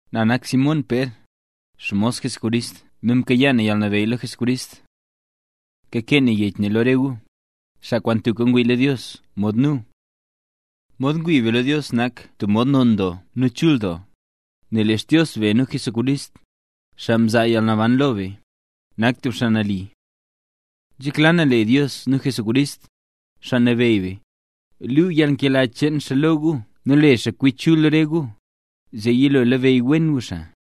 Na nak Simón Pér, xmos Jesucrist nu mkayaa na yalnabeyy lo Jesucrist. Kakee na yech ne lo re gu, xaa kwaan tubka ngwii lo Dios mod nu. Mod ngwii be lo Dios nak tub kwaan non doo nu chul doo, nel lee Xdios be nu Jesucrist, xaa mzaa yalnaban lo be, nak tub xaa nali. Nzhekla na lee Dios nu Jesús, Xaa Nabeyy be, luu yalnkela cheen xaa lo gu nu le xaa kwi chul re gu, zee yilo labeyy wen gu xaa.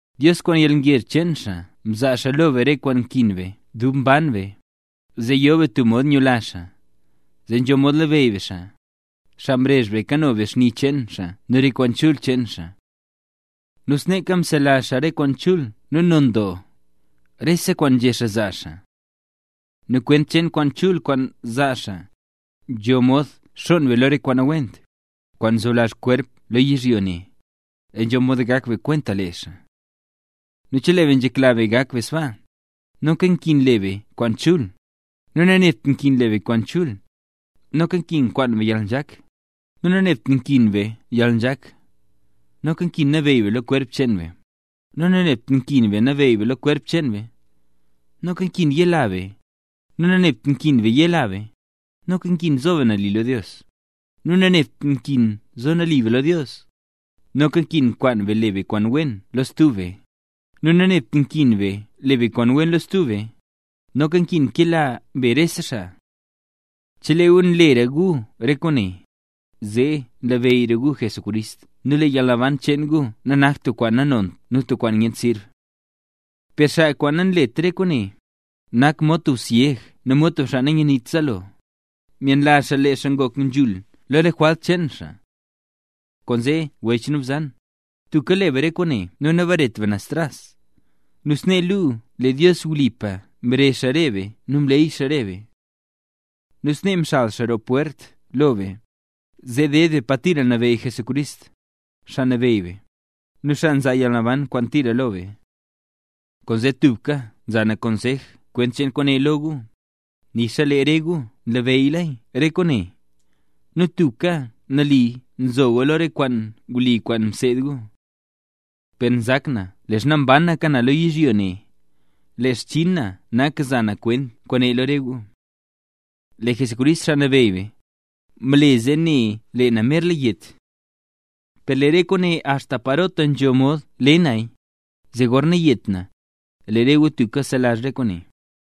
Dios kwaan yalngezh cheen xaa mzaa xaa lo be re kwaan nkin be dub mban be, zee yo be tub mod nyula xaa, zee nzho mod labeyy be xaa, xaa mrezh be kano be xni cheen xaa nu re kwaan chul cheen xaa. Nu sneeka, mzelazh xaa re kwaan chul nu non doo, rese kwaan nzhé xaa zaa xaa. Nu kwent cheen kwaan chul kwaan zaa xaa, nzho mod xonn be lo re kwaan nawent, kwaan nzoblazh kwerp lo yizhyo ne, zee nzho mod gak be kwenta lee xaa. Nu chelee be nzhekla be gak be sbaa, noka nkin le be kwaan chul; nu nanebt nkin be le be kwaan chul, noka nkin kwaan be yalnzhak; nu nanebt nkin be yalnzhak, noka nkin nabeyy be lo kwerp cheen be; nu nanebt nkin nabeyy be lo kwerp cheen be, noka nkin yela be; nu nanebt nkin yela be, noka nkin zo be nali lo Dios; nu nanebt nkin zo be nali lo Dios, noka nkin kwaan be le be kwaan wen lo stub be; nu nanebt nkin le be kwaan wen lo stub be, noka nkin kela be rese xaa. Chelee gu nlera gu re kwaane, zee labeyyra gu Jesucrist nu lee yalnaban cheen gu nanakt tub kwaan nanont nu tub kwaan nyent sirb. Per xaa kwaan nanlet re kwaane, nak mod tub syeg nu mod tub xaa nanyaniwent zaalo; myenlazh xaa lee xaa ngok nzhul lo re jwalt cheen xaa. Kwaanzee wech nu bzan, tubka le be re kwaane nu nabaret be naz tras, nu snee luu lee Dios wlipa mrezh re be nu mleey xaa re be. Nu snee nxal roo pwert lo be, zee deed be Pa Tira Nabeyy Jesucrist, Xaa Nabeyy be, nu xaa nzaa yalnaban kwaan tira lo be. Kwaanzee, tubka nza na konsej kwent cheen kwaane lo gu, nixa lee re gu nlabeyyla re kwaane, nu tubka nali nzo gu lo re kwaan wli kwaan mseed gu. Per nzak na leezha mbanaka na lo yizhyo ne, lee xchinn na nak za na kwent kwaane lo re gu. Lee Jesucrist, Xaa Nabeyy be, mle zee ne na lee na merla yet. Per le na re kwaane axta parota nzho mod le naya, zee gorna yet na, lee re gu tubka selazh re kwaane.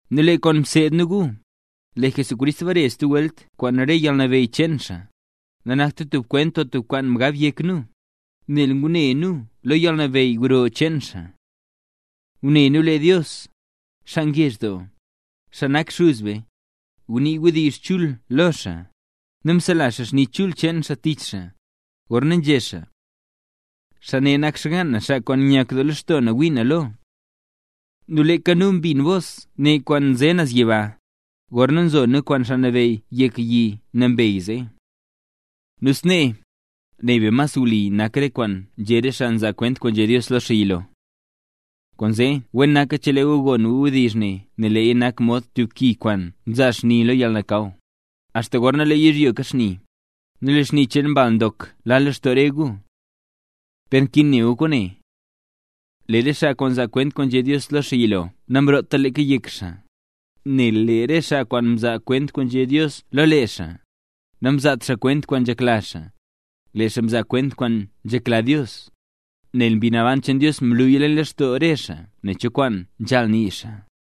Nu lee kwaan mseed nu gu, lee Jesucrist bare stub welt kwaan rese yalnabeyy cheen xaa, nanakta tub kwent o tub kwaan mgab yek nu, nel ngune nu lo yalnabeyy gro cheen xaa. Ngune nu lee Dios, xaa ngezh doo, xaa nak Xuz be, ngunii wdizh chul lo xaa, nu msela xaa xni chul cheen xaa tich xaa, gorna nzhé xaa: “Xaa ne nak xgaan na, xaa kwaan nyak doo lextoo na ngwii na lo”. Nu leeka nu mbin bos ne kwaan nze naz yiba, gorna mzo nu kwaan Xaa Nabeyy yek yi nambey zee. Nu snee, ne be mas wli nak re kwaan nzhé re xaa nzaa kwent kwaan nzhé Dios lo lee xaa yilo. Kwaanzee wen naka chelee gu gon gu wdizh ne nel leeya nak mod tub ki kwaan nzaa xni lo yalnakaw, axta gorna lee yizhyo kaxni, nu lee xni cheen Mbal Ndok la lextoo re gu. Per nkin ne gu kwaane: Lee re xaa mzaa kwent kwaan nzhé Dios lo lee xaa yilo namroota leeka yek xaa, nel lee re xaa mzaa kwent kwaan nzhé Dios lo lee xaa, xaa nambey nak, namzaat xaa kwent kwaan nzhekla xaa, lee xaa mzaa kwent kwaan nzhekla Dios, nel lee Mbi Naban cheen Dios mluya lextoo re xaa ne cho kwaan nzhaal nii xaa.